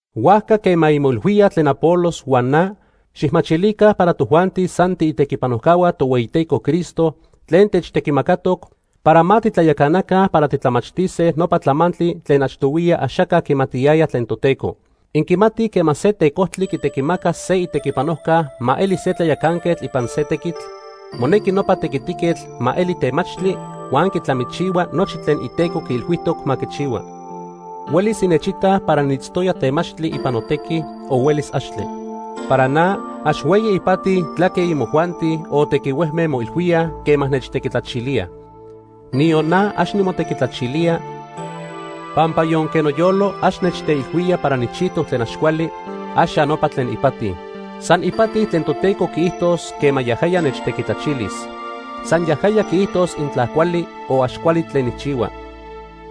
Huajca quema inmoilhuíaj tlen Apolos huan na, xijmachilica para tojuanti san tiitequipanojcahua Tohueyiteco Cristo tlen techtequimacatoc para ma titlayacanaca para titlamachtise nopa tlamantli tlen achtohuiya axaca quimatiyaya tlen Toteco. Inquimatij quema se tecojtli quitequimaca se itequipanojca ma eli se tlayacanquetl ipan se tequitl, monequi nopa tequitiquetl ma eli temachtli huan quitlamichihua nochi tlen iteco quiilhuijtoc ma quichihua. Huelis innechitaj para niitztoya temachtli ipan notequi, o huelis axtle. Para na, ax hueyi ipati tlaque imojuanti o tequihuejme moilhuíaj quema nechtequitlachilíaj. Niyon na ax nimotequitlachilía, pampa yonque noyolo ax nechteilhuía para nijchijtoc tlen ax cuali, ax ya nopa tlen ipati. San ipati tlen Toteco quiijtos quema yajaya nechtequitlachilis. San yajaya quiijtos intla cuali o ax cuali tlen nijchihua.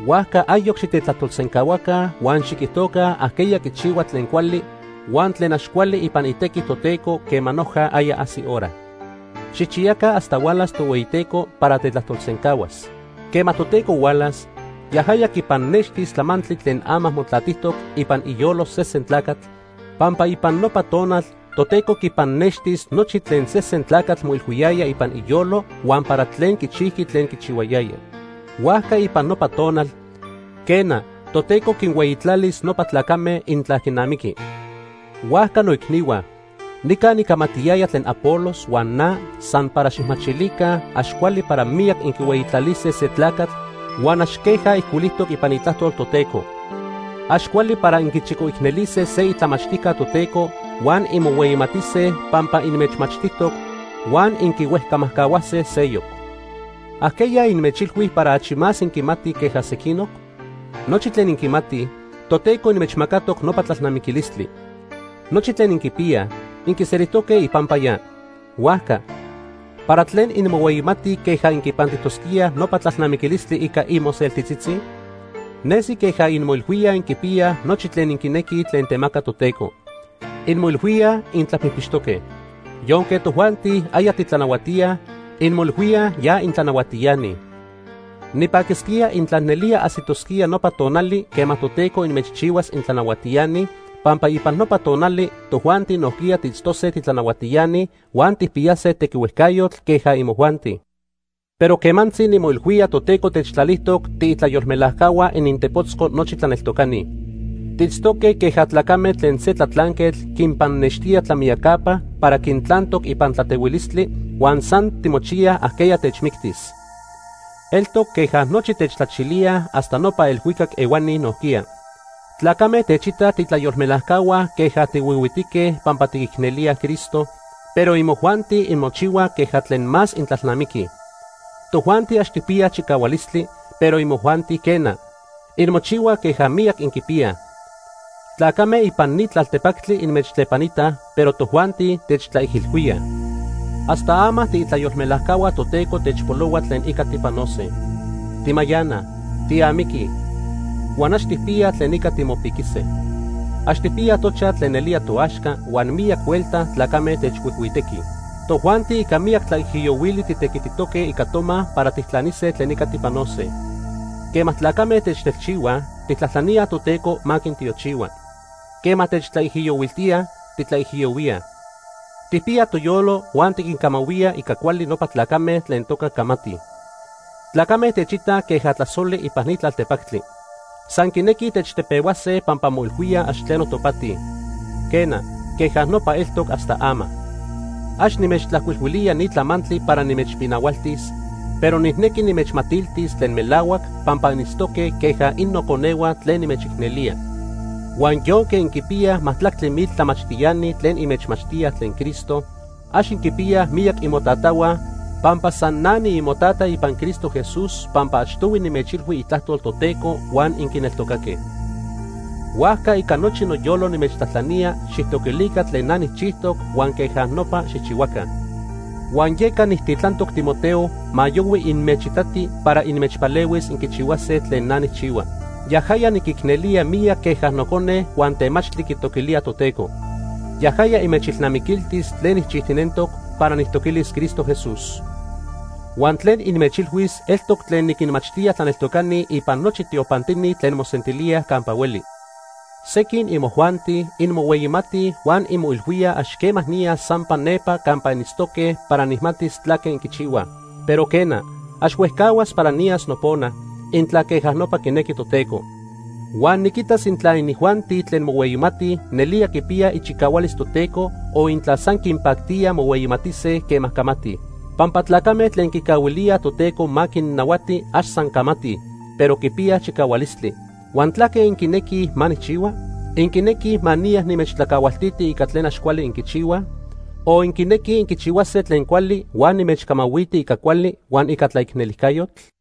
Huajca ayoc xitetlajtolsencahuaca huan xiquijtoca ajqueya quichihua tlen cuali huan tlen ax cuali ipan itequi Toteco quema noja aya ajsi hora. Xijchiyaca hasta hualas Tohueyiteco para tetlajtolsencahuas. Quema Toteco hualas, yajaya quipannextis tlamantli tlen ama motlatijtoc ipan iyolo sesen tlacatl, pampa ipan nopa tonal Toteco quipannextis nochi tlen sesen tlacatl moilhuiyaya ipan iyolo huan para tlen quichijqui tlen quichihuayaya. Huajca ipan nopa tonal, quena, Toteco quinhueyitlalis nopa tlacame intla quinamiqui. Huajca noicnihua, nica nicamatiyaya tlen Apolos huan na san para xijmachilica ax cuali para miyac inquihueyitlalise se tlacatl huan ax queja ijcuilijtoc ipan Itlajtol Toteco. Ax cuali para inquichicoicnelise se itlamachtijca Toteco huan inmohueyimatise pampa inmechmachtijtoc huan inquihuejcamajcahuase seyoc. ¿Ajqueya inmechilhui para achi más inquimatij queja sequinoc? Nochi tlen inquimatij, Toteco inmechmacatoc nopa tlalnamiquilistli. Nochi tlen inquipiyaj inquiselijtoque ipampa ya. Huajca, ¿para tlen inmohueyimatij queja inquipantijtosquíaj nopa tlalnamiquilistli ica imoseltitzitzi? Nesi queja inmoilhuíaj inquipiyaj nochi tlen inquinequij tlen temaca Toteco. Inmoilhuíaj intlapijpixtoque. Yonque tojuanti aya titlanahuatíaj, inmoilhuíaj ya intlanahuatiani. Nipaquisquía intla nelía ajsitosquía nopa tonali quema Toteco inmechchihuas intlanahuatiani, pampa ipan nopa tonali tojuanti nojquiya tiitztose titlanahuatiani huan tijpiyase tequihuejcayotl queja imojuanti. Pero quemantzi nimoilhuía Toteco techtlalijtoc tiitlayolmelajcahua inintepotzco nochi tlaneltocani. Tiitztoque queja tlacame tlen se tlatlanquetl quinpannextía tlamiyacapa para quintlantoc ipan tlatehuilistli huan san timochiyaj ajqueya techmictis. Eltoc queja nochi techtlachilíaj hasta nopa elhuicac ehuani nojquiya. Tlacame techitaj tiitlayolmelajcahua queja tihuihuitique pampa tiquicnelíaj Cristo, pero imojuanti inmochihuaj queja tlen más intlalnamiquij. Tojuanti ax tijpiyaj chicahualistli, pero imojuanti quena, inmochihuaj queja miyac inquipiyaj. Tlacame ipan ni tlaltepactli inmechtlepanitaj, pero tojuanti techtlaijilhuíaj. Hasta ama tiitlayolmelajcahua Toteco techpolohua tlen ica tipanose. Timayanaj, tiamiquij huan ax tijpiyaj tlen ica timopiquise. Ax tijpiyaj tochaj tlen nelía toaxca huan miyac huelta tlacame techhuijhuitequij. Tojuanti ica miyac tlaijiyohuili titequititoque ica toma para tijtlanise tlen ica tipanose. Quema tlacame techtelchihuaj, tijtlajtlaníaj Toteco ma quintiochihua. Quema techtlaijiyohuiltíaj, tiquijiyohuíaj. Tijpiyaj toyolo huan tiquincamahuíaj ica cuali nopa tlacame tlen toca camatij. Tlacame techitaj queja tlasoli ipan ni tlaltepactli. San quinequij techtepehuase pampa moilhuíaj ax tleno topati. Quena, queja nopa eltoc hasta ama. Ax nimechtlajcuilhuilía ni tlamantli para nimechpinahualtis, pero nijnequi nimechmatiltis tlen melahuac pampa initztoque queja innoconehua tlen nimechicnelía. Huan yonque inquipiyaj majtlactli mil tlamachtiani tlen inmechmachtíaj tlen Cristo, ax inquipiyaj miyac imotatahua, pampa san na niimotata ipan Cristo Jesús pampa achtohui nimechilhui itlajtol Toteco huan inquineltocaque. Huajca ica nochi noyolo nimechtlajtlanía, xijtoquilica tlen na nijchijtoc huan queja nopa xijchihuaca. Huan yeca nijtitlantoc Timoteo ma yohui inmechitati para inmechpalehuis inquichihuase tlen na nijchihua. Yajaya niquicnelía miyac queja nocone huan temachtli quitoquilía Toteco. Yajaya inmechilnamiquiltis tlen nijchijtinentoc para nijtoquilis Cristo Jesús. Huan tlen inmechilhuis eltoc tlen niquinmachtía tlaneltocani ipan nochi tiopantini tlen mosentilíaj campa hueli. Sequin imojuanti inmohueyimatij huan inmoilhuíaj ax quema niyas sampa nepa campa initztoque para nijmatis tlaque inquichihuaj. Pero, quena, ax huejcahuas para niyas nopona, intla queja nopa quinequi Toteco. Huan niquitas intla inijuanti tlen mohueyimatij nelía quipiyaj ichicahualis Toteco o intla san quinpactía mohueyimatise quema camatij. Pampa tlacame tlen quicahuilíaj Toteco ma quinnahuati ax san camatij, pero quipiyaj chicahualistli. Huan ¿tlaque inquinequij ma nijchihua? ¿Inquinequij ma niya nimechtlacahualtiti ica tlen ax cuali inquichihuaj? O ¿inquinequij inquichihuase tlen cuali huan nimechcamahuiti ica cuali huan ica tlaicnelijcayotl?